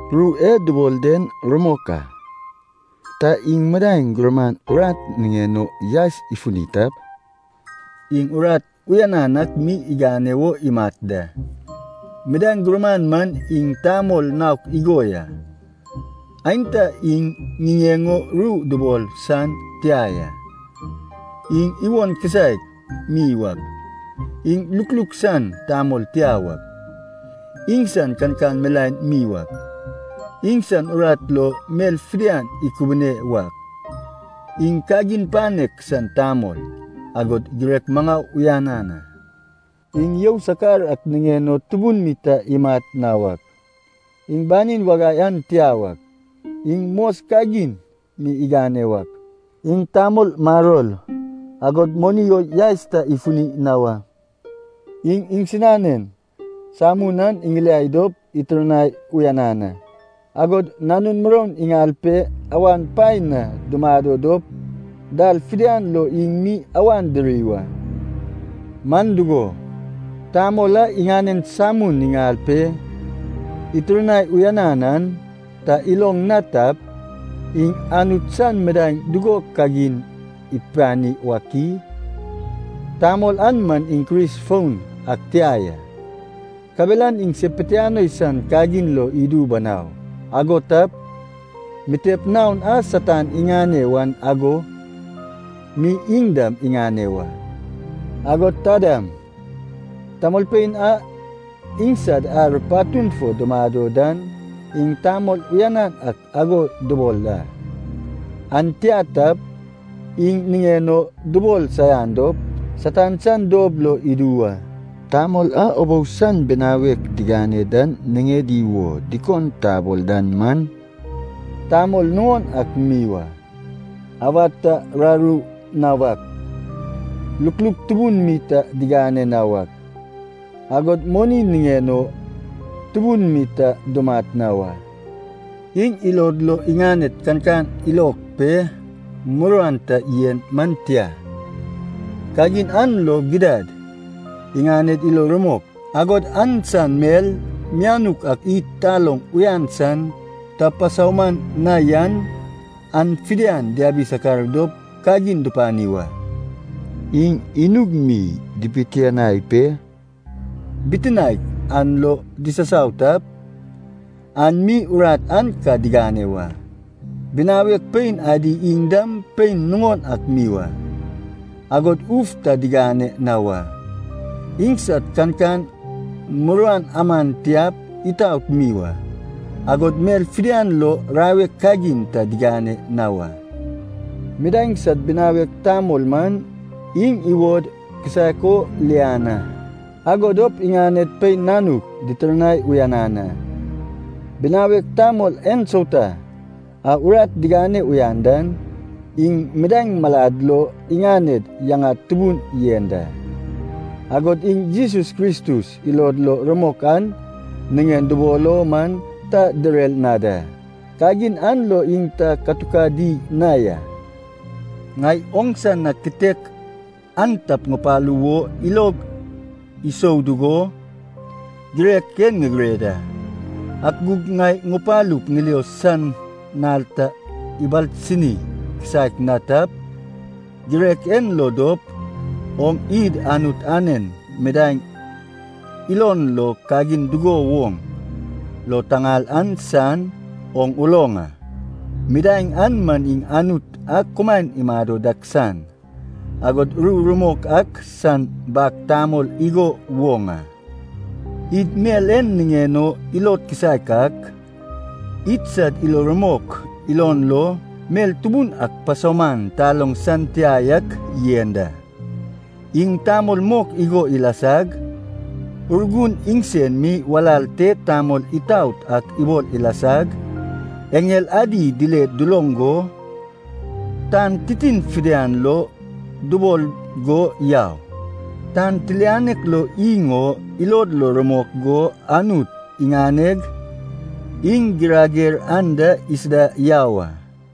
Ru e dubol den rumok a. Ta iŋ midaeŋ gurman urat niŋen o yaes ifuni tap, iŋ urat uyanan ak mi igane wo imat da. Midaeŋ gurman man iŋ tamol naok igo ya: aenta iŋ niŋen o ru dubol san tia ya, iŋ iwon kisaek mi wak, iŋ lukluk san tamol tia wak, iŋsan kankan milaen mi wak, iŋsan urat lo mel fidian ikubune wak, iŋ kagin panek san tamol, agod girek maŋau uyanan a. Iŋ you sakar ak niŋen o tubun mi ta imat na wak, iŋ banin wagai an tia wak, iŋ mos kagin mi igane wak, iŋ tamol maror, agod moni o yaes ta ifuni na wa. Iŋ iŋsinanen samun an iŋiliai dop itirnai uyanan a, agod nanun muroun iŋal pe awan paen na dumado dop dal fidian lo iŋ mi awan diri wa. Man dugo, tamol a iŋanen samun iŋal pe itirnai uyanan an ta iloŋ na tap, iŋ Anut san midaeŋ dugo kagin ipani wak i? Tamol an man iŋ Kris foun ak tia ya. Kabelan iŋ se pitianoi san kagin lo idu banau, ago tap, mitep naon a Satan iŋane wan ago mi iŋ dam iŋane wa. Agod ta dam, tamolpein a idsad ar patun fo dumado dan iŋ tamol uyanan ak ago dubol a. An tia tap, iŋ niŋen o dubol saian dop Satan san dob lo idu wa. Tamol a ubou san binawek digane dan niŋedi wo dikon tabol dan man, tamol nuŋon ak mi wa, awad ta raru na wak, lukluk tubun mi ta digane na wak, agod moni niŋen o tubun mi ta dumat na wa. Iŋ ilod lo iŋaned kankan ilok pe muruan ta yen man tia, kagin an lo gidad idaned ilo rumok, agod an san mel mianuk ak id taloŋ uyan san ta pasauman na yan, an fidian diabi sakar dop kagin dupani wa. Iŋ inug mi dibitiniai pe bitinaek an lo disasau tap, an mi urat an ka digane wa. Binawek pein adi iŋ dam pein nuŋon ak mi wa, agod uf ta digane na wa. Iŋsad kankan muruan aman tiap itaot mi wa, agod mel fidian lo rawek kagin ta digane na wa. Midaeŋ sad binawek tamol man iŋ iwod kisaek o lian a, ago dop iŋaned pein nanuk, ditirnai uyanan a. Binawek tamol ensauta a urat digane uyan dan, iŋ midaeŋ malad lo iŋaned yaŋad tubun yen da. Agod iŋ Jesus Kristus ilod lo rumok an niŋen dubol o man ta direr na da, kagin an lo iŋ ta katukadi na ya. Ŋai oŋsa na kitek an tap ŋupalu wo ilog isou dugo girek en ŋigire da. Ak gug ŋai ŋupalup ŋilio san nal ta ibalsini kisaek na tap, girek en lo dop oŋ id Anut anen midaeŋ ilon lo kagin dugo woŋ lo taŋal an san, oŋ uloŋ a. Midaeŋ an man iŋ Anut a kumaen imado dak san, agod ru rumok ak san bag tamol igo woŋ a. Id mel en niŋen o ilod kisaek ak, idsad ilo rumok ilon lo mel tubun ak pasauman taloŋ san tia yak yen da: Iŋ tamol mok igo ilasag, Urgun iŋsen mi walal te tamol itaot ak ibol ilasag, eŋel adi dile duloŋ go, tan titin fidian lo dubol go yau, tan tilianek lo iŋ o ilod lo rumok go, Anut iŋaneg iŋ girager anda isida yau a.